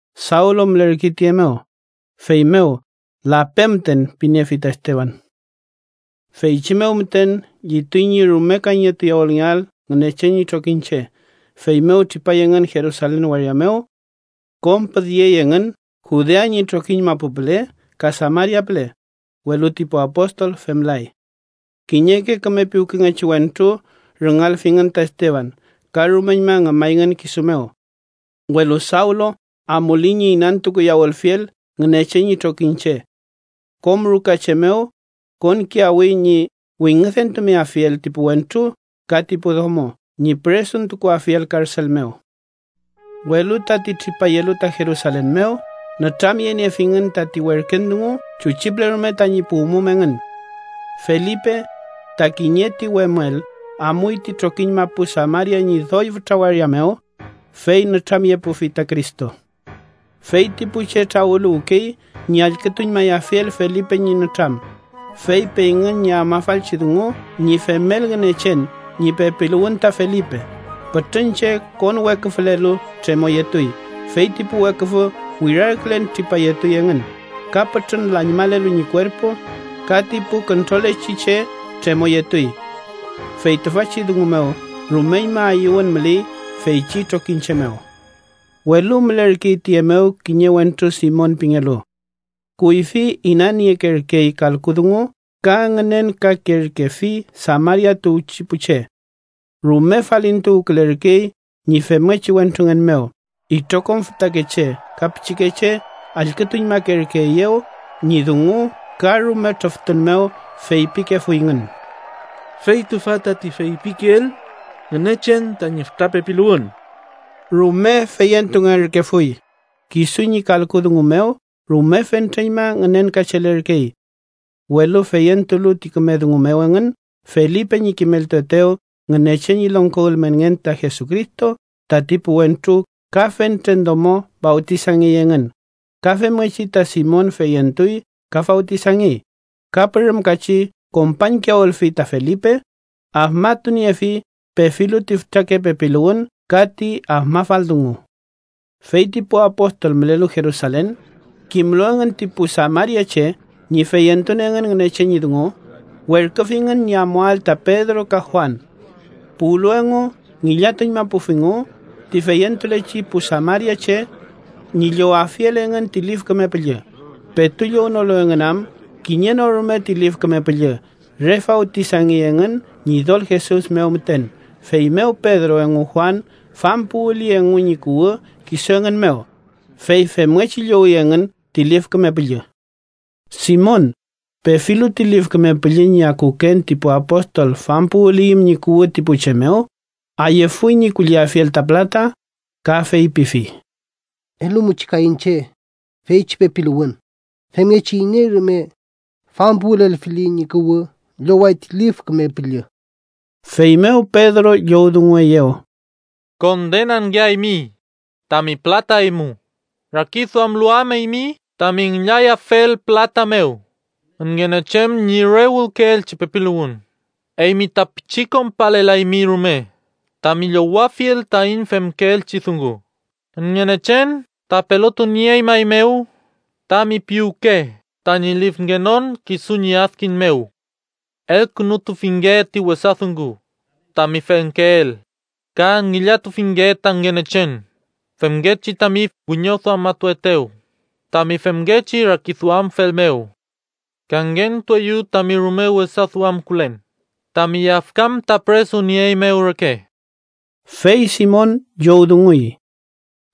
Sawlu mülerkey tiye mew, feymew “lape müten” piniefi ta Esteban. Feychi mew müten llituy ñi rume kayñetuyawülngeael Ngünechen ñi trokiñche, feymew tripay engün Jerusalen waria mew. Kom püdyey engün Judea ñi trokiñ mapu püle ka Samaria püle, welu ti pu apostol femlay. Kiñeke küme piwkengechi wentru rüngalfingün ta Esteban ka rumeñma ngümayngün kisu mew. Welu Sawlu, amuley ñi inantukuyawülfiel Ngünechen ñi trokiñche. Kom rukache mew konkiyawi ñi wingüdentumeafiel ti pu wentru ka ti pu domo ñi püresuntukuafiel karsel mew. Welu tati tripayelu ta Jerusalen mew nütramyeniefingün tati werken dungu chuchi püle rume tañi puwmum engün. Felipe, ta kiñe ti wemüel, amuy ti trokiñ mapu Samaria ñi doy fütra waria mew, fey nütramyepufi ta Cristo. Fey ti pu che trawüluwkey ñi allkütuñmayafiel Felipe ñi nütram, fey peyngün ñi afmafalchi dungu ñi femel Ngünechen ñi pepiluwün ta Felipe. Pütrün che konweküfülelu, tremoyetuy. Fey ti pu weküfü wirarkülen tripayetuy engün. Ka pütrün lañmalelu ñi kuerpu ka ti pu küntrolechi che tremoyetuy. Fey tüfachi dungu mew rumeñma ayüwün müley feychi trokiñche mew. Welu mülerkey tüye mew kiñe wentru Simon pingelu. Kuyfi inaniekerkey kalku dungu ka ngünenkakerkefi Samaria tuwchi pu che. Rume falintuwkülerkey ñi femngechi wentrungen mew. Itrokom fütakeche ka pichikeche allkütuñmakerkeeyew ñi dungu ka rume trüftun mew feypikefuyngün: “Fey tüfa tati feypikeel Ngünechen tañi fütra pepiluwün.” Rume feyentungerkefuy; kisu ñi kalku dungu mew rume fentreñma ngünenkachelerkey. Welu feyentulu ti küme dungu mew engün Felipe ñi kimeltuetew Ngünechen ñi longko ülmenngen ka Jesucristo, tati pu wentru ka fentren domo fawtisangey engün. Ka femngechi ta Simon feyentuy ka fawtisangey, ka pürümkachi kompañkiyawülfi ta Felipe, afmatuniefi pefilu ti fütrake pepiluwün ka ti afmafal dungu. Fey ti pu apostol mülelu Jerusalen, kimlu engün ti pu samariache ñi feyentun engün Ngünechen ñi dungu, werküfingün ñi amuael ta Pedro ka Juan. Puwlu engu, ngillatuñmapufingu ti feyentulechi pu samariache, ñi llowafiel engün ti Lif Küme Püllü, petu llownolu engün am kiñe no rume ti Lif Küme Püllü. Re fawtisangey engün Ñidol Jesus mew müten. Feymew Pedro engu Juan fampuwüli engu ñi kuwü kisu engün mew, fey femngechi llowi engün ti Lif Küme Püllü. Simon, pefilu ti Lif Küme Püllü ñi akuken ti pu apostol fampuwüliyüm ñi kuwü ti pu che mew, ayüfuy ñi kulliafiel ta pülata, ka feypifi: —Elumuchi kay iñche feychi pepiluwün, femngechi iney rume fampuwülelfili ñi kuwü lloway ti Lif Küme Püllü. Feymew Pedro llowdungueyew: —¡Kondenangeaymi tami pülata eymu, rakiduamlu am eymi tami ngillayafel pülata mew Ngünechen ñi re wülkeelchi pepiluwün! Eymi ta pichi konpalelaymi rume tami llowafiel taiñ femkeelchi dungu, Ngünechen ta pelotunieñmaeymew tami piwke tañi lifngenon kisu ñi adkiñ mew. Elkünutufinge ti wesa dungu tami femkeel, ka ngillatufinge ta Ngünechen femngechi tami wiñoduamatuaetew tami femngechi rakiduamfel mew. Kangentueyu tami rume wesaduamkülen, tami yafkan ta püresunieeymew reke. Fey Simon llowdunguy: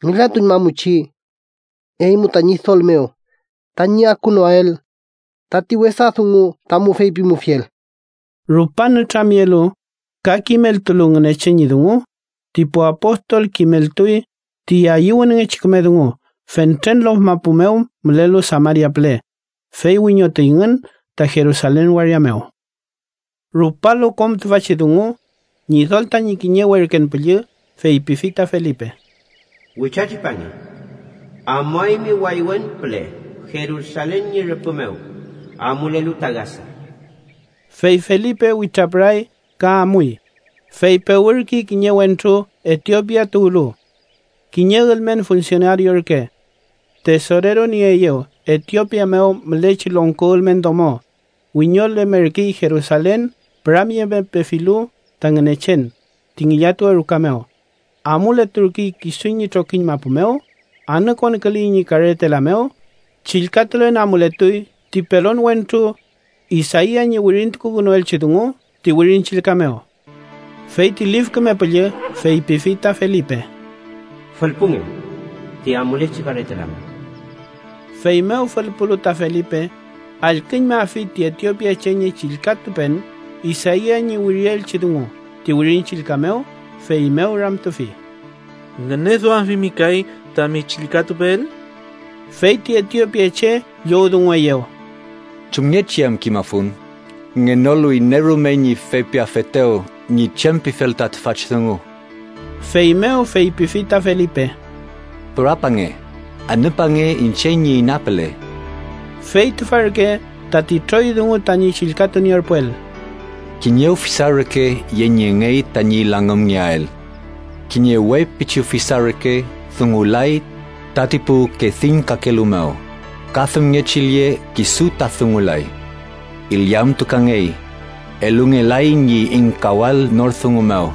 —Ngillatuñmamuchi eymu ta Ñidol mew, tañi akunoael tati wesa dungu tamu feypimufiel. Rupan nütramyelu ka kimeltulu Ngünechen ñi dungu, ti pu apostol kimeltuy ti ayüwünngechi küme dungu, fentren lof mapu mew mülelu Samaria püle, fey wiñotuyngün ta Jerusalen waria mew. Rupalu kom tüfachi dungu, Ñidol tañi kiñe werken püllü feypifi ta Felipe: “Witratripange. Amuaymi waywen püle Jerusalen ñi rüpü mew, amulelu ta Gasa.” Fey Felipe witrapüray ka amuy, fey pewürkey kiñe wentru Etiopia tuwlu. Kiñe ülmen funsionario ürke. Tesorero nieeyew Etiopia mew mülechi longko ülmen domo, wiñolemerkey Jerusalen püramyemepefilu ta Ngünechen ti ngillatuwe ruka mew. Amuleturkey kisu ñi trokiñ mapu mew. Anükonküley ñi karetela mew. Chillkatulen amuletuy ti pelon wentru Isaia ñi wirintukukünuelchi dungu ti Wirin Chillka mew. Fey ti Lif Küme Püllü feypifi ta Felipe: “Fülpunge ti amulechi karetela mew.” Feymew fülpulu ta Felipe, allküñmafi ti etiopiache ñi chillkatupen Isaia ñi wirielchi dungu ti Wirin Chillka mew, feymew ramtufi: —¿Ngüneduamfimi kay tami chillkatupeel? Fey ti Etiopiache llowdungueyew: —¿Chumngechi am kimafun, ngenolu iney rume ñi feypiafetew ñi chem pifel ta tüfachi dungu? Feymew feypifi ta Felipe: —Pürapange. Anüpange iñche ñi ina püle. Fey tüfa ürke tati troy dungu tañi chillkatunierpuel: “Kiñe ufisa reke yeniengey tañi langümngeael. Kiñe we pichi ufisa reke dungulay tati pu kediñkakelu mew, ka femngechi lle kisu ta dungulay. Illamtukangey, elungelay ñi ingkawael nor dungu mew.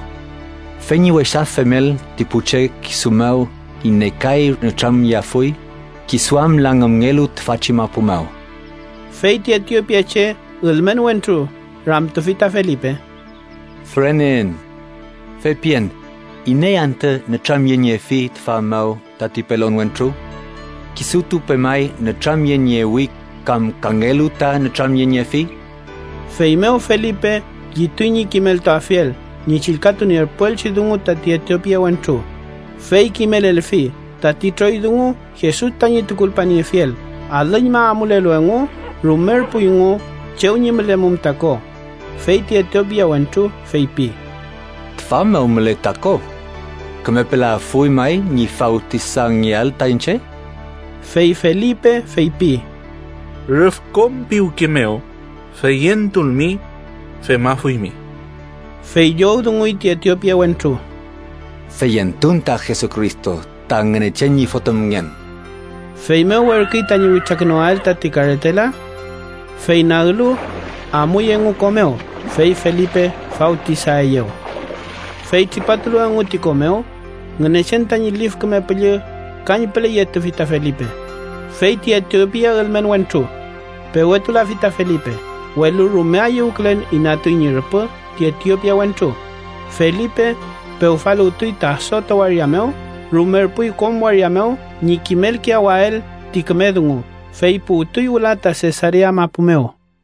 ¿Fey ñi wesa femel ti pu che kisu mew iney kay nütramyeafuy? Kisu am langümngelu tüfachi mapu mew.” Fey ti etiopiache ülmen wentru ramtufi ta Felipe: —Füreneen. Feypien, ¿iney anta nütramyeniefi tüfa mew tati pelon wentru? ¿Kisutu pemay nütramyeniewi kam kangelu ta nütramyeniefi? Feymew Felipe llituy ñi kimeltuafiel ñi chillkatunierpuelchi dungu tati etiopia wentru, fey kimelelfi tati troy dungu Jesus tañi tukulpaniefiel. Alüñma amulelu engu, rumerpuyngu chew ñi mülemum ta ko, fey ti etiopia wentru feypi: —Tüfa mew müley ta ko. ¿Kümepelaafuy may ñi fawtisangeael ta iñche? Fey Felipe feypi: —Rüf kom piwke mew feyentulmi, femafuymi. Fey llowdunguy ti etiopia wentru: —Feyentun ta Jesucristo ta Ngünechen ñi Fotümngen. Feymew werküy tañi witrakünuael tati karetela. Fey naglu, amuy engu ko mew, fey Felipe fawtisaeyew. Fey tripatulu engu ti ko mew, Ngünechen tañi Lif Küme Püllü kañpüle yetufi ta Felipe, fey ti etiopia ülmen wentru pewetulafi ta Felipe, welu rume ayüwkülen inatuy ñi rüpü ti etiopia wentru. Felipe pewfaluwtuy ta Asoto waria mew. Rumerpuy kom waria mew ñi kimelkiyawael ti küme dungu, fey puwtuy wüla ta Sesarea mapu mew.